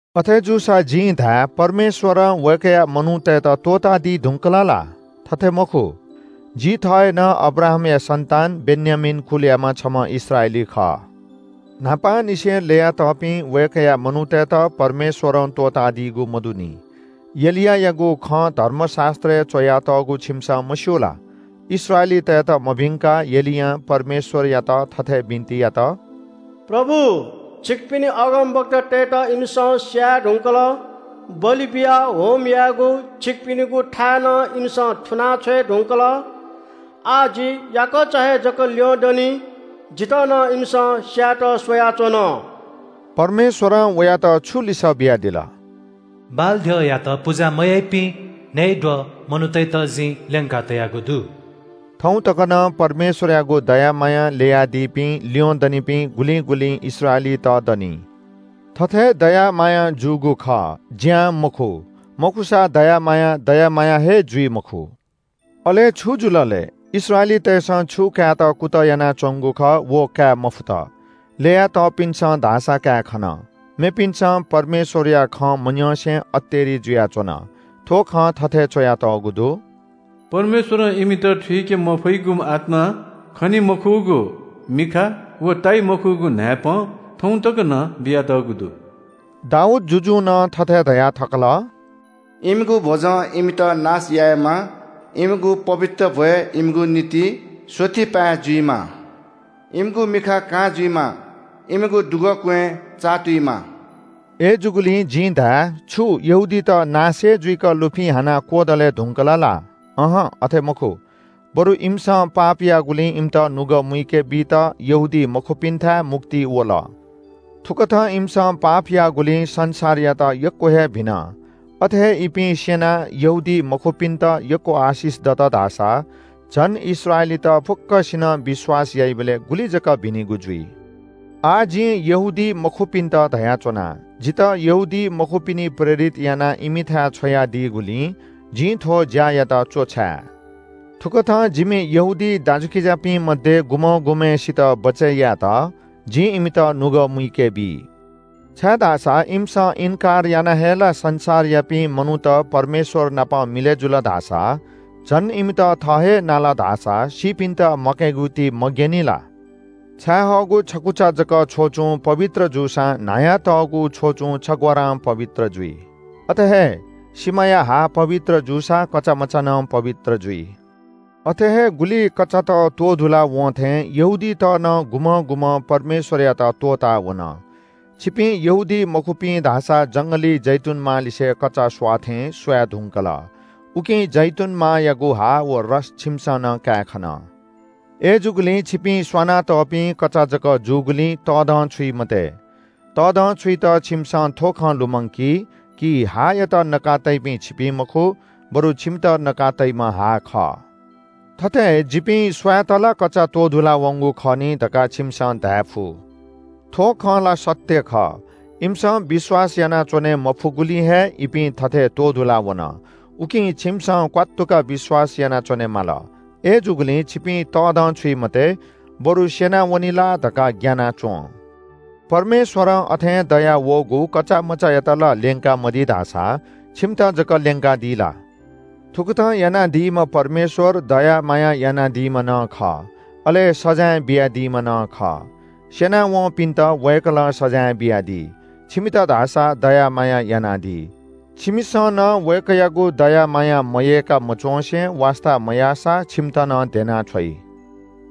अथे जूसा जिं धाये – परमेश्‍वरं वय्‌कःया मनूतय्‌त त्‍वःतादी धुंकल ला? थथे मखु। जि थः हे नं अब्राहामया सन्‍तान, बेन्‍यामीन कुलयाम्‍ह छम्‍ह इस्राएली खः। न्‍हापांनिसें ल्‍ययातःपिं वय्‌कःया मनूतय्‌त परमेश्‍वरं त्‍वःतादीगु मदुनि। एलियायागु खँ धर्मशास्‍त्रय् च्‍वयातःगु छिमिसं मस्‍यू ला? इस्राएलीतय्‌त मभिंकाः एलियां परमेश्‍वरयात थथे बिन्‍ति यात – “प्रभु, छिकपिनि अगमवक्तातय्‌त इमिसं स्‍याये धुंकल। बलि बियाः होम यायेगु छिकपिनिगु थाय् नं इमिसं थुनाछ्वये धुंकल। आः जि याकःचा हे जक ल्‍यंदनि, जितः नं इमिसं स्‍यायेत स्‍वयाच्‍वन।” परमेश्‍वरं वयात छु लिसः बियादिल? “बालद्यःयात पुजा मयाइपिं न्‍हय्‌द्वः मनूतय्‌त जिं ल्‍यंकातयागु दु।” थौं तक नं परमेश्‍वरयागु दया मायां ल्‍ययादीपिं ल्‍यंदनिपिं गुलिं गुलिं इस्राएलीत दनि। थथे दया मायां जूगु खः, ज्‍यां मखु, मखुसा दया माया दया माया हे जुइ मखु। अले छु जुल लय्? इस्राएलीतय्‌सं छु कायेत कुतः यानाच्‍वंगु खः व काये मफुत। ल्‍यया तःपिन्‍सं धाःसा काये खन। मेपिन्‍सं परमेश्‍वरया खँ मन्‍यंसे अतेरि जुयाच्‍वन। थ्‍व खँ थथे च्‍वयातःगु दु – “परमेश्‍वरं इमित थुइके मफइगु आत्‍मा, खनी मखुगु मिखा व ताइ मखुगु न्‍हाय्‌पं, थौं तक नं बियातःगु दु।” दाऊद जुजुं नं थथे धया थकल – “इमिगु भ्‍वजं इमित नाश यायेमा, इमिगु पवित्र भ्‍वय् इमिगु निंतिं स्‍वःतिपाँय् जुइमा। इमिगु मिखा कां जुइमा, इमिगु दुगःक्‍वँय् चाःतुइमा।” अय्‌जूगुलिं जिं धाये – छु यहूदीत नाश हे जुइक लुफिं हानाः क्‍वदले धुंकल ला? अहं, अथे मखु, बरु इमिसं पाप याःगुलिं इमित नुगः मुइके बीत यहूदीमखुपिन्‍थाय् मुक्ति वल। थुकथं इमिसं पाप याःगुलिं संसारयात यक्‍व हे भिन, अथे हे इपिं स्‍यनाः यहूदीमखुपिन्‍त यक्‍व आशिष दत धाःसा झन इस्राएलीत फुक्‍कसिनं विश्‍वास याइबलय् गुलि जक भिनिगु जुइ। आः जिं यहूदीमखुपिन्‍त धयाच्‍वना। जितः यहूदीमखुपिनि प्रेरित यानाः इमिथाय् छ्वयादीगुलिं जिं थ्‍व ज्‍या यात तःधंके। थुकथं जिमि यहूदी दाजुकिजापिं मध्‍ये गुम्‍हं गुम्‍हय्‌सित बचय् यायेत जिं इमित नुगः मुइके बी। छाय्‌धाःसा इमिसं इन्‍कार यानाः हे ला संसारयापिं मनूत परमेश्‍वर नाप मिलय् जुल धाःसा, झन इमित थः हे नाल धाःसा सीपिन्‍त म्‍वाकेगु ति मग्‍यनी ला? छायेहःगु छकुचा जक छ्वचुं पवित्र जूसां न्‍हायातःगु छ्वचुं छग्‍वारां पवित्र जुइ। अथे हे सिमाया हा पवित्र जूसा कचामचा नं पवित्र जुइ। अथे हे गुलि कचात त्‍वधुला वं थें यहूदीत नं गुम्‍हं गुम्‍हं परमेश्‍वरयात त्‍वःताः वन। छिपिं यहूदीमखुपिं धाःसा जंगली जैतूनमा लिसे कचा स्‍वाःथें स्‍वाये धुंकल। उकिं जैतूनमायागु हा व रस छिमिसं नं काये खन। अय्‌जूगुलिं छिपिं स्‍वाना तःपिं कचा जक जूगुलिं तःधंछुइ मते। तःधंछुइत छिमिसं थ्‍व खँ लुमंकी– हायात नका तइपिं छिपिं मखु, बरु छिमित नका तइम्‍ह हा खः। थथे “जिपिं स्‍वायेत ला कचा त्‍वधुला वंगु खः नि” धकाः छिमिसं धायेफु। थ्‍व खँ ला सत्‍य खः। इमिसं विश्‍वास यानाच्‍वने मफुगुलिं हे इपिं थथे त्‍वधुला वन, उकिं छिमिसं क्‍वात्तुक विश्‍वास यानाच्‍वने माल। अय्‌जूगुलिं छिपिं तःधंछुइ मते, बरु स्‍यनावनी ला धकाः ग्‍याना च्‍वँ। परमेश्‍वरं अथें दयावःगु कचामचायात ला ल्‍यंका मदी धाःसा छिमित जक ल्‍यंकादी ला? थुकथं यानादीम्‍ह परमेश्‍वर दया माया यानादीम्‍ह नं खः, अले सजाँय बियादीम्‍ह नं खः। स्‍यना वंपिन्‍त वय्‌कलं सजाँय बियादी, छिमित धाःसा दया माया यानादी। छिमिसं नं वय्‌कःयागु दया माया मयय्‌काः मच्‍वँसे वास्‍ता मयाःसा छिमित नं ध्‍यनाः छ्वइ।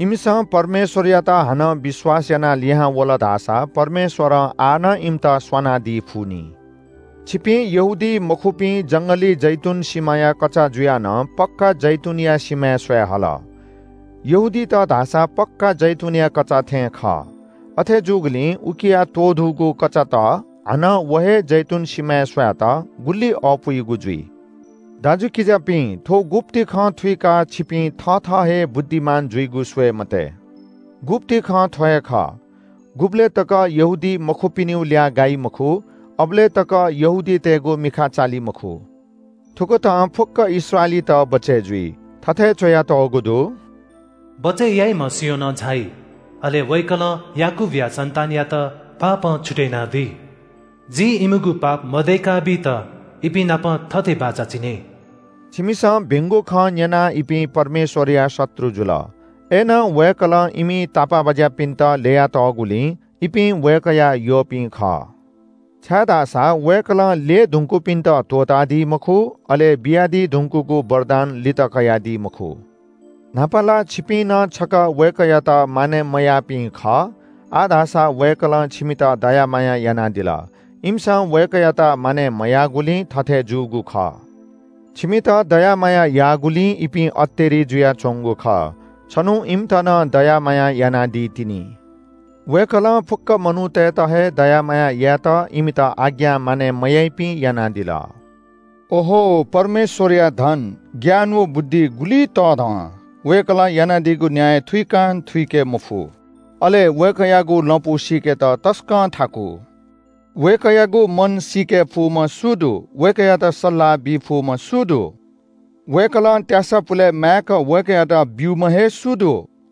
इमिसं परमेश्‍वरयात हानं विश्‍वास यानाः लिहां वल धाःसा परमेश्‍वरं आः नं इमित स्‍वानादी फुनि। छिपिं यहूदीमखुपिं जंगली जैतून सिमाया कचा जुया नं पक्‍का जैतूनया सिमाय् स्‍वाये हल। यहूदीत धाःसा पक्‍का जैतूनया कचात थें खः। अथे जूगुलिं उकिया त्‍वधूगु कचात हानं व हे जैतून सिमाय् स्‍वायेत गुलि अःपुइगु जुइ! दाजुकिजापिं, थ्‍व गुप्‍ति खँ थुइकाः छिपिं थथः हे बुद्धिमान जुइगु स्‍वये मते। गुप्‍ति खँ थ्‍व हे खः – गुबलय् तक यहूदीमखुपिनिगु ल्‍याः गाइ मखु अबलय् तक यहूदीतय्‌गु मिखा चाली मखु। थुकथं फुक्‍क इस्राएलीत बचय् जुइ। थथे च्‍वयातःगु दु – “बचय् याइम्‍ह सियोनं झाइ, अले वय्‌कलं याकूबया सन्‍तानयात पापं छुतय् यानादी। जिं इमिगु पाप मदय्‌का बीत इपिंनापं थथे बाचा चिने।” छिमिसं भिंगु खँ न्‍यनाः इपिं परमेश्‍वरया शत्रु जुल। अय्‌नं वय्‌कलं इमि तापाःबाज्‍यापिन्‍त ल्‍यया तःगुलिं इपिं वय्‌कःया यःपिं खः। छाय्‌धाःसा वय्‌कलं ल्‍यय् धुंकूपिन्‍त त्‍वःतादी मखु, अले बियादी धुंकूगु वरदान लित कयादी मखु। न्‍हापा ला छिपिं नं छकः वय्‌कःयात मानय् मयाःपिं खः, आः धाःसा वय्‌कलं छिमित दया माया यानादिल। इमिसं वय्‌कःयात मानय् मयाःगुलिं थथे जूगु खः। छिमित दया माया याःगुलिं इपिं अतेरि जुयाच्‍वंगु खः। छन्‍हु इमित नं दया माया यानादी तिनि। वय्‌कलं फुक्‍क मनूतय्‌त हे दया माया यायेत इमित आज्ञा मानय् मयाइपिं यानादिल। अहो! परमेश्‍वरया धन, ज्ञान व बुद्धि गुलि तःधं! वय्‌कलं यानादीगु न्‍याय थुइकां थुइके मफु। अले वय्‌कःयागु लँपु सीकेत तसकं थाकु। वय्‌कःयागु मन सीके फुम्‍ह सु दु? वय्‌कःयात सल्‍लाह बी फुम्‍ह सु दु? वय्‌कलं त्‍यासा पुले माय्‌क वय्‌कःयात ब्‍यूम्‍ह हे सु दु?